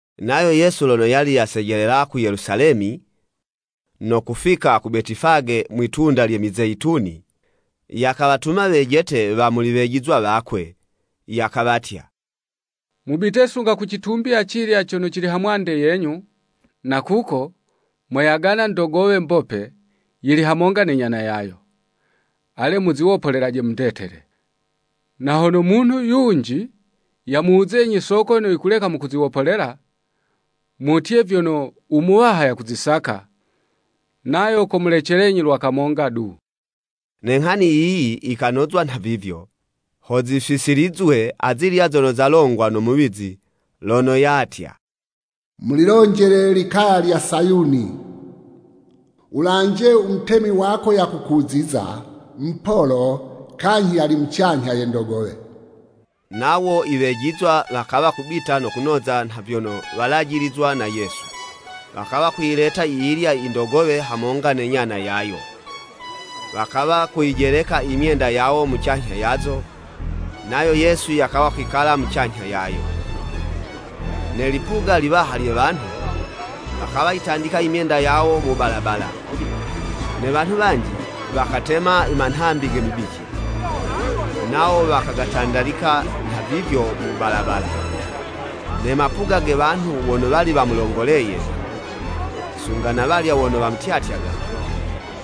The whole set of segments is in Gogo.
Nayo Yesu lono yali yasejelela ku Yelusalemi, no kufika ku Betifage mwitunda lye Mizeyituni, yakawatuma wejete wa muli wejizwa wakwe, yakawatya, “Mubite sunga kucitumbi acilya cono cili ha mwande yenyu, na kuko, moyagana ndogowe, mbope, yili hamonga ne nyana yayo. Ale muziwopolelaje mundetele. Na hono munhu yunji yamuwuzenyi soko yono yikuleka mukuziwopolela, mutye vyono, ‘U Muwaha yakuzisaka,’ nayo komulecelenyi lwa kamonga du.” Ne nghani yiyi yikanozwa nhavivyo, ho zifisilizwe azilya zono zalongwa no muwizi lono yatya, “Mulilonjele ilikaya lya Sayuni, Wulanje u Mutemi wako yakukuziza! Mupolo, kanyhi yali mucanyha ye ndogowe.” Nawo iwejizwa wakawa kubita no kunoza nha vyono walajilizwa na Yesu. Wakawa kuyileta yiyilya i ndogowe hamonga ne nyana yayo, wakawa kuyijeleka i myenda yawo mucanyha yazo, nayo Yesu yakawa kwikala mucanyha yayo. Ne lipuga liwaha lye wanhu, wakayitandika i myenda yawo mu balabala, ne wanhu wanji, wakatema i manhambi ge mibici, nawo wakagatandalika nha vivyo mu balabala. Ne mapuga ge wanhu wono wali wamulongoleye, sunga na walya wono wamutyatyaga,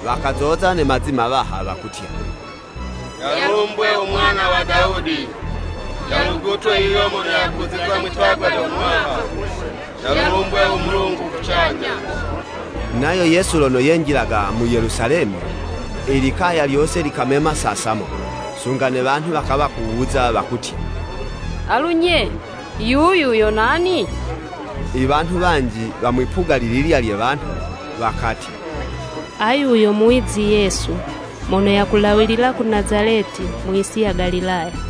wakazoza ne mazi mawaha wakutya, “Yalumbwe u Mwana wa Dawudi! Yalugutwe yuyo mono yakuziza mwitagwa lyo Muwaha! Yalumbwe u Mulungu kucanyha!” Nayo Yesu lono yenjilaga mu Yelusalemi, i likaya lyose likamema sasamo. Sunga ne wanhu wakawa kuwuza wakutya, “Alu, nye, Yuyu yo nani?” Iwanhu wanji wa mwipuga lililya lye wanhu wakatya, “Ayu yo muwizi Yesu, mono yakulawilila ku Nazaleti mu yisi ya Galilaya.”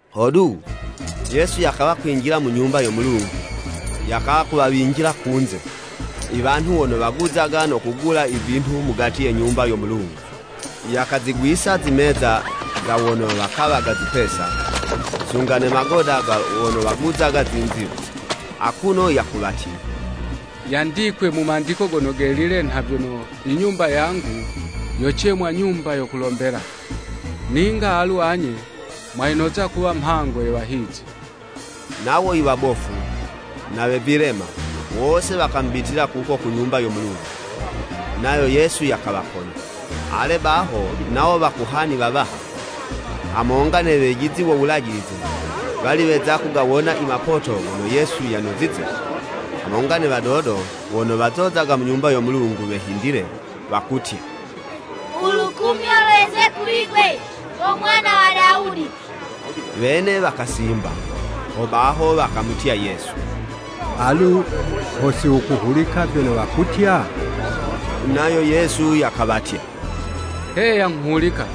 Hodu, Yesu yakawa kwinjila mu Nyumba yo Mulungu yakawa kuwawinjila kunze, iwanhu wono waguzaga no kugula ivinhu mugati ye Nyumba yo Mulungu, yakazigwisa zimeza za wono wakawaga zipesa, sunga ne magoda ga wono waguzaga zinziwa. Akuno yakuwatya, “Yandikwe mu Mandiko Gono Gelile nha vyono, ‘I Nyumba yangu yocemwa, nyumba yo kulombela.’ Ninga alu anye, mwayinoza kuwa mhango ye wahizi.” Nawo iwabofu, na we vilema, wose wakamubitila kuko ku Nyumba yo Mulungu, nayo Yesu yakawaponya. Ale baho, nawo wakohani wawaha, hamonga ne wejizi wo Wulajilize wali weza kugawona i mapoto gono Yesu yanozize, hamonga ne wadodo wono wazozaga mu Nyumba yo Mulungu wehindile, wakutya “U lukumyo lweze kuli'gwe, go Mwana wa Dawudi,” wene wakasimba. Hobaho wakamutya Yesu, “Alu ho siwukuhulika vyono wakutya?” Nayo Yesu yakawatya, “Heya nghuhulika!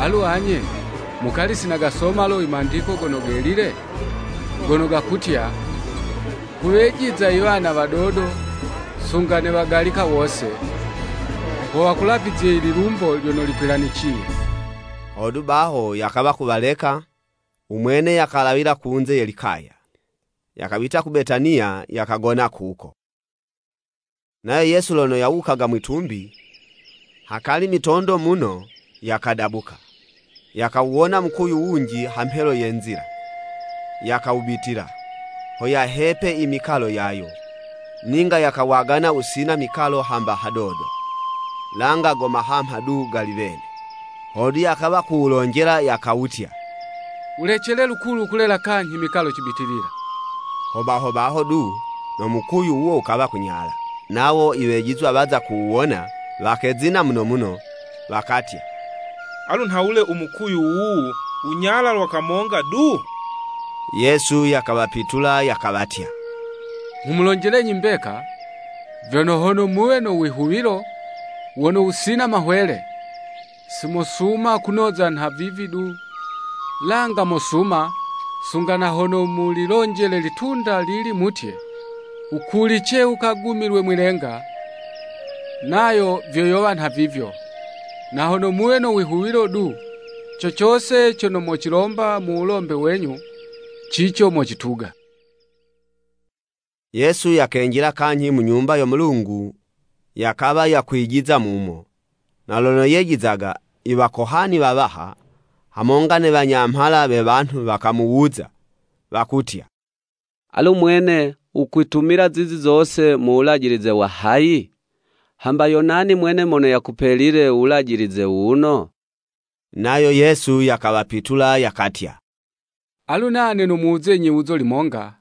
Alu anye, mukali si nagasoma lo Mandiko gaga Gono Gelile? Gono gakutya, ‘Kuwejiza iwana wadodo, sunga ne wagalika wose, ho wakulavizye lilumbo lyono likwilaniciye!'" Hodu baho, yakawa kuwaleka, u mwene yakalawila kunze ye likaya, yakabita ku Betaniya, yakagona kuko. Nayo Yesu lono yawuyaga mwitumbi, hakali mitondo muno yakadabuka. Yakawuwona mukuyu wunji ha mhelo ye nzila, yakawubitila, ho yahepe imikalo yayo, ninga yakawagana wusina mikalo hamba hadodo, langa go mahamha du gali wene. Hodu yakawa kuwulonjela yakawutya, “Wulecele lukulu kulela kanyhi mikalo cibitilila!” Hobaho baho du, no mukuyu wuwo wukawa kunyala. Nawo iwejizwa waza kuwuwona, wakezina muno muno, wakatya, “Alu nhawule u mukuyu wuwu wunyala lwa kamonga du?” Yesu yakawapitula yakawatya, “Nghumulonjelenyi mbeka, vyono hono muwe no wihuwilo wono wusina mahwele, si mosuma kunoza nha vivi du, langa mosuma sunga na hono mulilonjele ilitunda lili mutye, ‘Wukulice wukegumile mwi'lenga,’ nayo vyo yowa nha vivyo. Na hono muwe no wihuwilo du, co cose cono mocilomba mu wulombe wenyu, cico mocituga.” Yesu yakenjila kanyhi mu Nyumba yo Mulungu yakawa yakwijiza mumo, na lono yejizaga, i wakohani wawaha, hamonga ne wanyamhala we wanhu wakamuwuza, wakutya, “Alu mwene, wukwitumila zizi zose mu wulajilize wa hayi? Hamba yo nani mwene mono yakupelile u wulajilize wuwuno?” Nayo Yesu yakawapitula yakatya, “Alu nane nomuwuzenyi yiwuzo limonga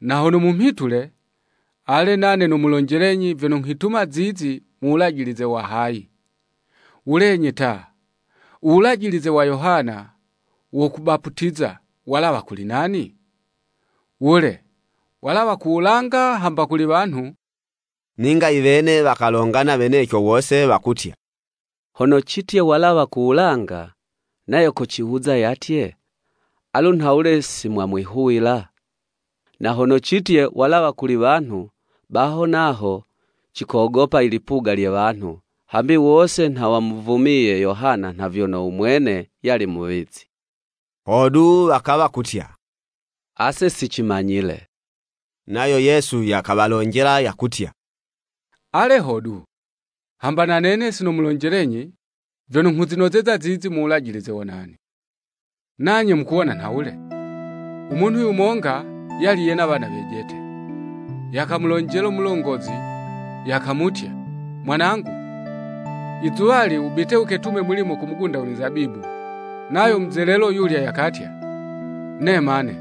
na hono mumhitule, ale, nane ho nomulonjelenyi vyono nghwitumila zizi mu wulajilize wa hayi. Wulenyi ta, u wulajilize wa Yohana wo kubaputiza walawa kuli nani? Wule, walawa ku wulanga hamba kuli wanhu?” Ninga iwene wakalongana weneco wose wakutya, “Hono citye, ‘Walawa ku wulanga,’ nayo kociwuza yatye, ‘Alu nhawule si mwamwihuwila?’ Na hono citye, ‘Walawa kuli wanhu,’ baho naho cikogopa i lipuga lye wanhu, hambi wose nha wamuvumiye Yohana nha vyono u mwene yali muwizi.” Hodu wakawa kutya, “Ase si cimanyile!” Nayo Yesu, yakawalonjela yakutya, “Ale hodu, hamba na nene sinomulonjelenyi vyono nghuzinozeza zizi mu wulajilize wa nani.” “Nanye mukuwona nhawule? U munhu yumonga yali yena wana wejete. Yakamulonjela mulongozi yakamutya, ‘Mwanangu izuwali wubite wuketume mulimo ku mugunda we mizabibu.’ Nayo muzelelo yulya yakatya, ‘Nema ne!’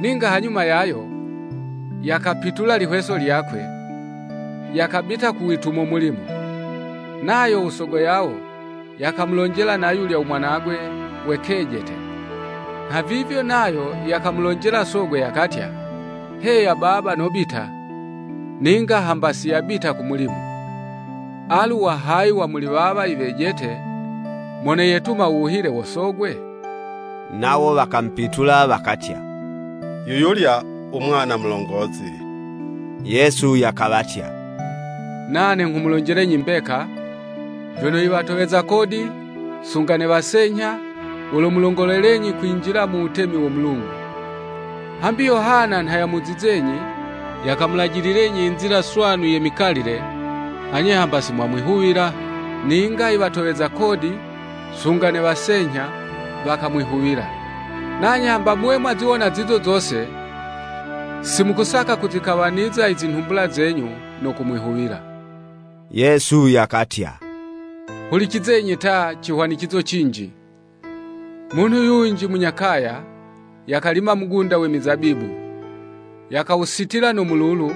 Ninga hanyuma yayo, yakapitula lihweso lyakwe, yakabita kuwitumo mulimo. Nayo u sogo yawo yakamulonjela na yulya u mwanagwe we kejete, nha vivyo, nayo yakamulonjela sogwe yakatya, ‘Heya baba, nobita!’ Ninga hamba si yabita ku mulimo. Alu wa hayi wa muli wawa i wejete mono yetuma u wuhile wo sogwe?” Nawo wakamupitula wakatya, “Yuyulya u mwana mulongozi.” Yesu yakawatya, “Nane nghumulonjelenyi mbeka, vyono i watoweza kodi, sunga ne wasenyha, womulongolelenyi kwinjila mu wutemi wo Mulungu. Hambi Yohana nha yamuzizenyi yakamulajililenyi i nzila swanu ye mikalile, anye hamba si mwamwihuwila, ninga i watoweza kodi, sunga ne wasenyha wakamwihuwila. Nanye hamba muwe mwaziwona zizo zose, si mukasaka kuzikawaniza i zinhumbula zenyu no kumwihuwila.” Yesu yakatya, “Hulicizenyi ta, cihwanicizo cinji, Munhu yunji munya kaya, yakalima mugunda we mizabibu, yakawusitila no mululu,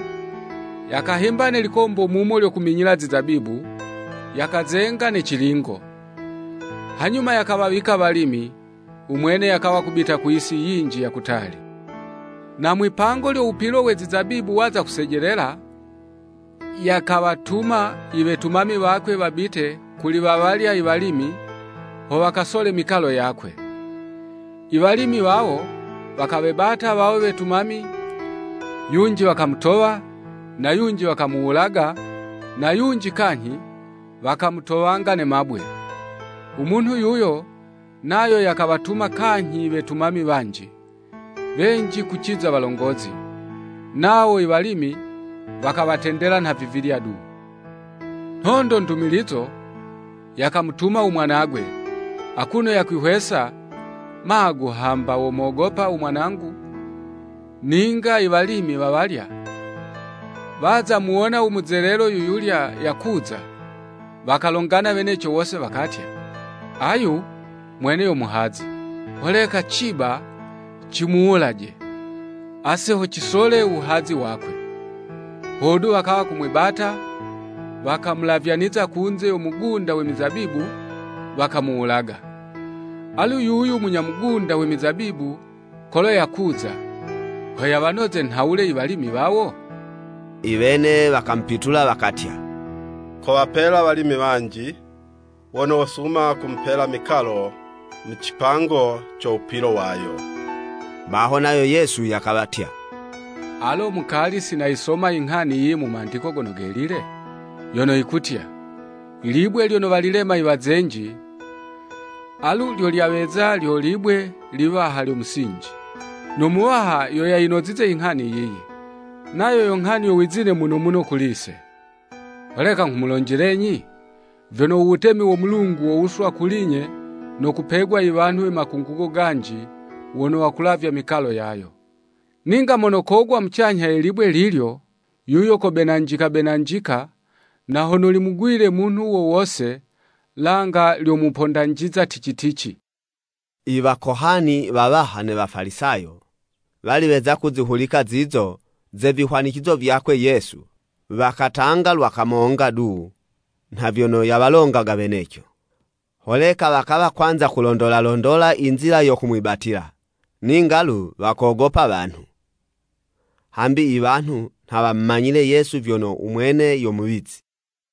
yakahimba ne likombo mumo lyo kuminyila zizabibu, yakazenga ne cilingo. Hanyuma yakawawika walimi, u mwene yakawa kubita ku yisi yinji ya kutali. Na mwi'pango lyo wupilo we zizabibu waza kusejelela, yakawatuma i wetumami wakwe wabite kuli wawalya iwalimi, ho wakasole mikalo yakwe. I walimi wawo, wakawebata wawo wetumami, yunji wakamutowa na yunji wakamuwulaga, na yunji kanyhi wakamutowanga ne mabwe. U munhu yuyo, nayo yakawatuma kanyhi i wetumami wanji, wenji kuciza walongozi, nawo i walimi, wakawatendela nha vivilya du. Nhondo ndumilizo, yakamutuma u mwanagwe, akuno yakwihwesa, ‘Magu, hamba womogopa u mwanangu.’ Ninga i walimi wawalya, waza muwona u muzelelo yuyulya yakuza, wakalongana weneco wose wakatya, ‘Ayu mwene yo muhazi, holeka ciba cimuwulaje, ase ho cisole u wuhazi wakwe!’ Hodu wakawa kumwibata, wakamulavyaniza kunze yo mugunda we mizabibu, wakamuwulaga. Alu yuyu munya mugunda we mizabibu kolo yakuza, ho yawanoze nhawule i walimi wawo?” Iwene wakamupitula wakatya, “Kowapela walimi wanji, wono wosuma kumupela mikalo mu cipango co wupilo wayo.” Baho nayo Yesu yakawatya, “Alo mukali si nayisoma inghani yiyi mu Mandiko Gono Gelile? Yono yikutya, ‘Ilibwe lyono walilema i wazenji alu lyo lyaweza lyo libwe liwaha lyo musinji. No Muwaha yo yayinozize inghani yiyi. Nayo yo nghani yo wizine muno muno kuli'se!’ “Holeka nghumulonjelenyi, vyono, u Wutemi wo Mulungu wowuswa kuli'nye no kupegwa i wanhu we makungugo ganji wono wakulavya mikalo yayo. [ Ninga mono kogwa mucanyha ye libwe lilyo, yuyo kobenanjika-benanjika, na hono limugwile munhu wo wose, langa lyomupondanjiza tici-tici.]” Iwakohani wawaha ne Wafalisayo, wali weza kuzihulika zizo ze vihwanicizo vyakwe Yesu, wakatanga lwa kamonga du nha vyono yawalongaga weneco. Holeka wakawa kwanza kulondola londola inzila yo kumwibatila, ninga lu wakogopa wanhu, hambi i wanhu nha wamumanya Yesu vyono u Mwene yo Muwizi.